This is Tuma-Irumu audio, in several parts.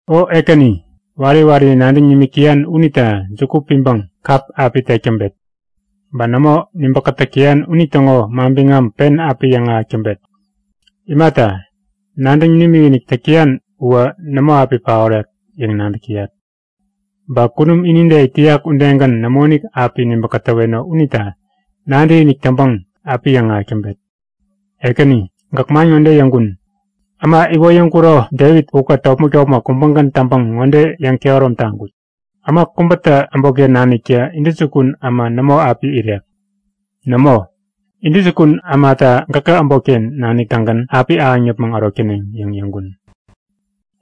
O Ekäni, wari wari nadäŋ nimik täyan unita juku piŋpäŋ kap api tek täŋpet. Ba nämo nibä-kätäk täyan unitäŋo manbiŋam pen api yäŋahäk täŋpet. Imata, nadäŋ nimikinik täk täyan uwä nämo api paorek yäŋ nadäk täyat. Ba kunum inide it täyak udegän nämoinik api nibä-katäweno unita nadäkinik täŋpäŋ api yäŋahäk täŋpet. Ekäni, gäk man ŋode yäŋkun; Äma iwoyäŋkuro Devit ukät topmäk-topmäk kubägän täŋpäŋ ŋode yäŋkehärom taŋkut; Äma kubätä äbotken naniktä intäjukun äma nämo api irek. Nämo, intäjukun ämata gäkä äbotken nanik-tägän api ahäŋ yäpmäŋ ärok täneŋ yäŋ yäŋkun.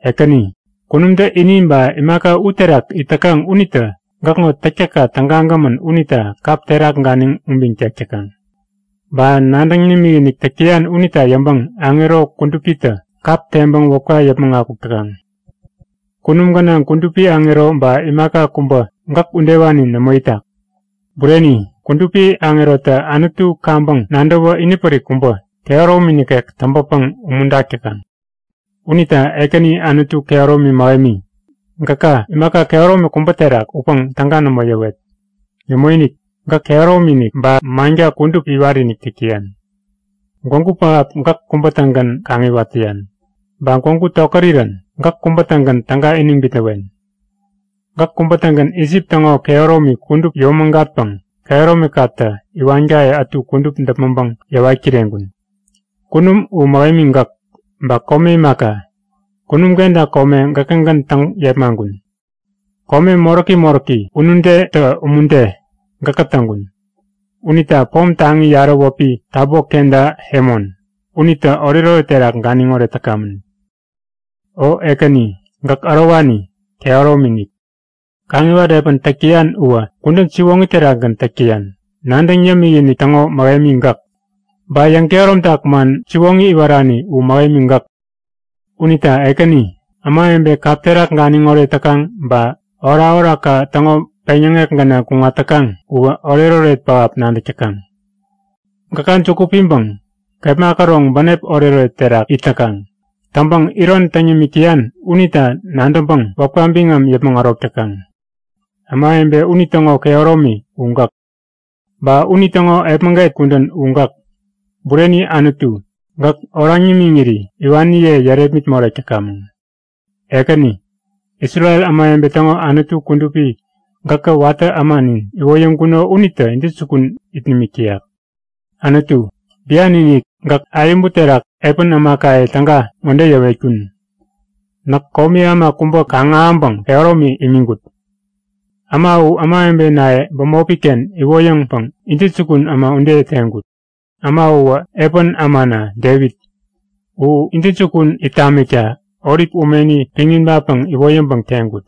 Ekäni, kunumtä ini ba imaka u terak it täkaŋ unitä gäkŋo täktäkka tägagämän unita kap terak ganiŋ ubiŋ tek täkaŋ. Ba nadäŋ nimikinik täk täyan unita yäŋpäŋ aŋero kudupitä kap teŋpäŋ wäpka yäpmäŋ akuk täkaŋ. Kunum gänaŋ kudupi aŋero ba imaka kubä gäk udewani nämo itak. Bureni, kudupi aŋerotä Anutu kaŋpäŋ nadäwä inipärik kubä, kehäromi nikek täŋpäpäŋ umuntak täkaŋ. Unita Ekäni Anutu kehäromi mähemi, gäka imaka kehäromi kubä terak utpäŋ täga nämo yäwet. Nämoinik, gäk kehäromi-inik, ba manka kudup iwat-inik täk täyan. Gwägu pähap gäk kubä-tägän kaŋiwat täyan. Ba gwägu tokärirän gäk kubä-tägän täga iniŋ bitnäwen. Gäk kubä-tägän Isip täŋo kehäromi kudup yomägatpäŋ kehäromikatä iwankaye ätu kudup däpmäŋpäŋ yäwat kireŋkun. Kunum u mähemi gäk, ba kome imaka. Kunum kenta kome gäkägän täŋ yepmaŋkun. Kome moräki moräki, unudetä umude gäkä täŋkun. Unita pom taŋi yarä wäpi Tabo kenta Hemon unitä oretoret terak ganiŋoret täkamän. O Ekäni, gäk ärowani, kehäromi-inik. Kaŋiwat epän täk täyan uwä kudän siwoŋi terakgän täk täyan. Nadäŋ yämik-inik täŋo mähemi gäk. Ba yäŋkehäromtak man siwoŋi iwarani u mähemi gäk. Unita Ekäni, ämawebe kap terak ganiŋoret täkaŋ ba orakorakka täŋo peŋyäŋek gänaŋ kuŋat täkaŋ uwä oretoret pähap nadäk täkaŋ. Gäka juku piŋpäŋ kepma käroŋ bänep oretoret terak it täkaŋ. Täŋpäŋ iron täŋ yämik täyan unita nadäŋpäŋ wäpka biŋam yäpmäŋ ärok täkaŋ. Ämawebe unitäŋo kehäromi u gäk. Ba unitäŋo epmäget kudän u gäk. Bureni Anutu, gäk oraŋ nimiŋiri iwaniye yärepmit morek täkamäŋ. Ekäni, Isrel ämawebe täŋo Anutu kudupi gäkä watä ämanin iwoyäŋkuno unitä intäjukun it nimik täyak. Anutu, bian-inik, gäk ayäbu terak epän ämakaye täga ŋode yäwetkun; Näk komi äma kubä kaŋ-ahäŋpäŋ kehäromi imiŋkut. Äma u ämawebenaye bämopiken iwoyäŋpäŋ intäjukun äma ude teŋkut. Äma uwä epän ämana Devit. U intäjukun it tamikta olip umeni piŋ ibatpäŋ iwoyäŋpäŋ teŋkut.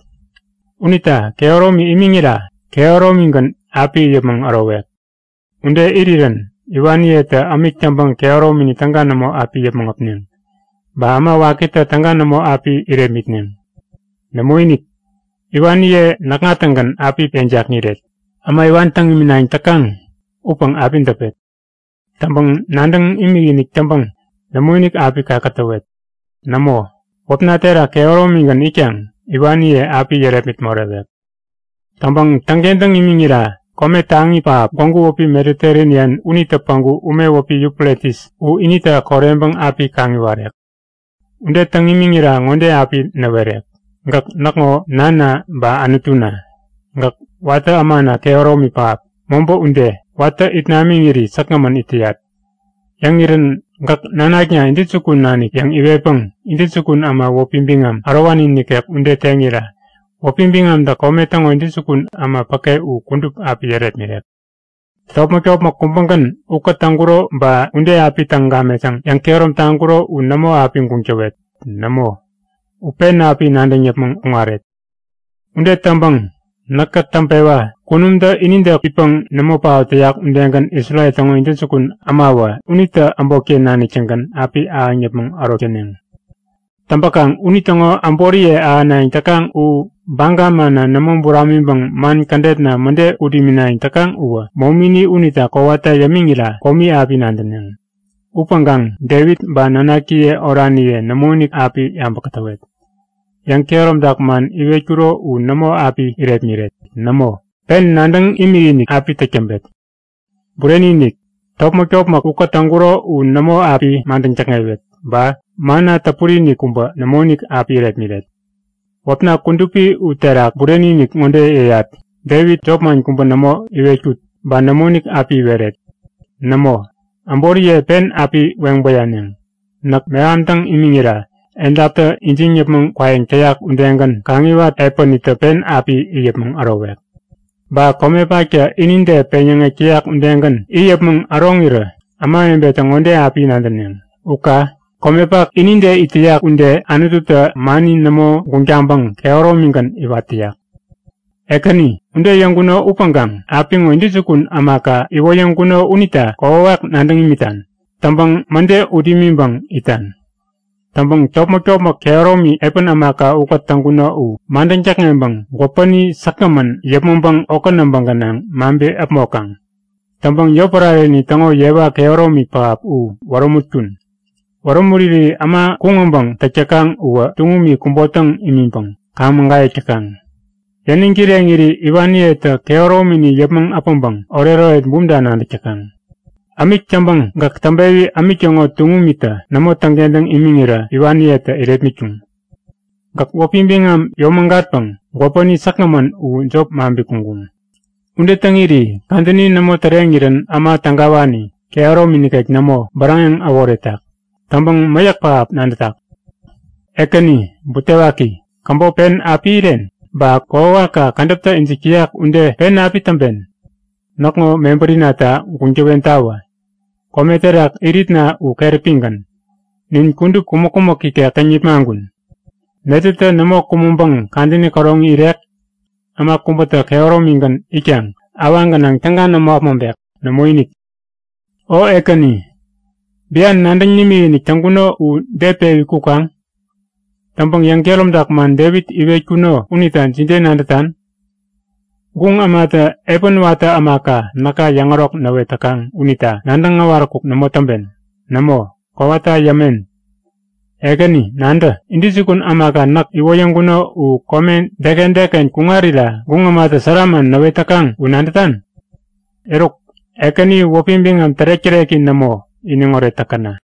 Unita kehäromi imiŋira kehäromigän api it yäpmäŋ ärowek. Ude irirän iwaniyetä ämik täŋpäŋ kehäromini täga nämo api yäpmäŋ äpneŋ, ba äma wakitä täga nämo api irepmitneŋ. Nämoinik, iwaniye näkŋa-tägän api yeŋ jakŋiret. Äma iwan täŋ iminayäŋ täkaŋ upäŋ api däpet. Täŋpäŋ nadäŋ imikinik täŋpäŋ nämoinik api kakätäwet. Nämo, wäpna terak kehäromigän itkaŋ iwaniye api yärepmit morewek. Täŋpäŋ täŋkentäŋ imiŋira kome taŋi pähap, gwägu wäpi Mediterenian unitä päŋku ume wäpi Yufretis u inita koreŋpäŋ api kaŋiwarek. Ude täŋ imiŋira ŋode api näwerek; Gäk näkŋo nanna ba Anutuna. Gäk watä ämana kehäromi pähap, mobä ude. Watä it namiŋiri säkgämän it täyat. Yäŋirän gäk nanakna intäjukun nanik yäŋ iwetpäŋ intäjukun äma wäpi biŋam ärowani nikek ude teŋira wäpi biŋamtä kome täŋo intäjukun äma päke u kudup api yärepmirek. Topmäk-topmäk kubägän ukät täŋkuro ba ude api täŋ gamet yäŋ yäŋkehärom taŋkuro u nämo api guŋ täwet. Nämo, u pen api nadäŋ yäpmäŋ kuŋaret. Ude täŋpäŋ näkä täŋpewa kunumtä inide itpäŋ nämo paot täyak udegän Isrel täŋo intäjukun ämawä, unitä äbotken nanik-tägän api ahäŋ yäpmäŋ ärok täneŋ. Täŋpäkaŋ unitäŋo äboriye ahänayäŋ täkaŋ u baga manna nämo buramiŋpäŋ man kädetna mäde ut iminayäŋ täkaŋ uwä momini unita kowata yämiŋira komi api nadäneŋ. Upäŋkaŋ Devit ba nanakiye oraniye nämoinik api yabäŋ kätäwet. Yäŋ-kehäromtak man iwetkuro u nämo api irepmiret. Nämo! Pen nadäŋ imikinik api täk täŋpet. Bureni-inik! Topmäk-topmäk ukät täŋkuro u nämo api madäŋ täkŋewet ba manna täpuri-inik kubä nämoinik api irepmiret. Wäpna kudupi u terak bureni-inik ŋode yäyat; Devit jopman kubä nämo iwetkut ba nämoinik api iweret. Nämo, äboriye pen api weŋ bäyaneŋ. Näk mehamtäŋ imiŋira edaptä ijiŋ yäpmäŋ kwayäŋ täyak udegän kaŋiwat epänitä pen api it yäpmäŋ ärowek. Ba komepaktä inide peŋyäŋek täyak udegän it yäpmäŋ äroŋirä ämawebetä ŋode api nadäneŋ; U ka! Komepak inide it täyak ude, Anututä mani nämo guŋ taŋpäŋ kehäromigän iwat täyak. Ekäni, ude yäŋkuno upäŋkaŋ apiŋo intäjukun ämaka iwoyäŋkuno unita kokwawak nadäŋ imitan. Täŋpäŋ mäde ut imiŋpäŋ itan. Täŋpäŋ topmäk-topmäk kehäromi epän ämaka ukät täŋkuno u madäŋ täkŋeŋpäŋ gwäpäni säkgämän yäpmäŋpäŋ okä näbä gänaŋ maŋpi-äpmokaŋ. Täŋpäŋ yotpärareni täŋo yewa kehäromi pähap u wärämutkun. Wärämuriri äma kuŋ-äbäŋ täk täkaŋ uwä tuŋumi kubotäŋ imiŋpäŋ kaŋ-mägayäk täkaŋ. Yäniŋ kireŋiri iwaniyetä kehäromini yäpmäŋ äpäŋpäŋ oretoret bumta nadäk täkaŋ. Ämik täŋpäŋ gäk täŋpewi ämik täŋo tuŋumitä nämo täŋkentäŋ imiŋirä iwaniyetä irepmitkuŋ. Gäk wäpi biŋam yomägatpäŋ gwäpäni säkgämän u jop maŋpi kuŋkuŋ. Ude täŋiri kadäni nämo täreŋirän äma tägawani, kehäromi nikek nämo, bäräŋeŋ äworetak. Täŋpäŋ mäyäk pähap nadätak. Ekäni, butewaki. Käbop pen api iren? Ba kokwawakka kädäptä ijik täyak ude pen api täŋpen. Näkŋo mebärinata guŋ täwentawä. Kome terak iritna u keräpigän. Nin kudup kumäk-kumäk ikek täŋ nipmaŋkun. Netätä nämo kumäŋpäŋ kadäni käroŋi irek? Äma kubätä kehäromigän itkaŋ awaŋ gänaŋ täga nämo äpmoŋpek? Nämoinik. O Ekäni, bian nadäŋ nimikinik täŋkuno u de pewi kukaŋ? Täŋpäŋ yäŋkehäromtak man Devit iwetkuno unita jide nadätan? Guŋ ämatä epän watä ämaka näka yäŋärok näwet täkaŋ unita nadäŋ äwaräkuk nämo täŋpen. Nämo, kowata yämen! Ekäni, nadä! Intäjukun ämaka näk iwoyäŋkuno u kome deken deken kuŋarira guŋ ämatä sära man näwet täkaŋ u nadätan? Eruk, Ekäni wäpi biŋam tärek-täreki nämo iniŋoret täkäna!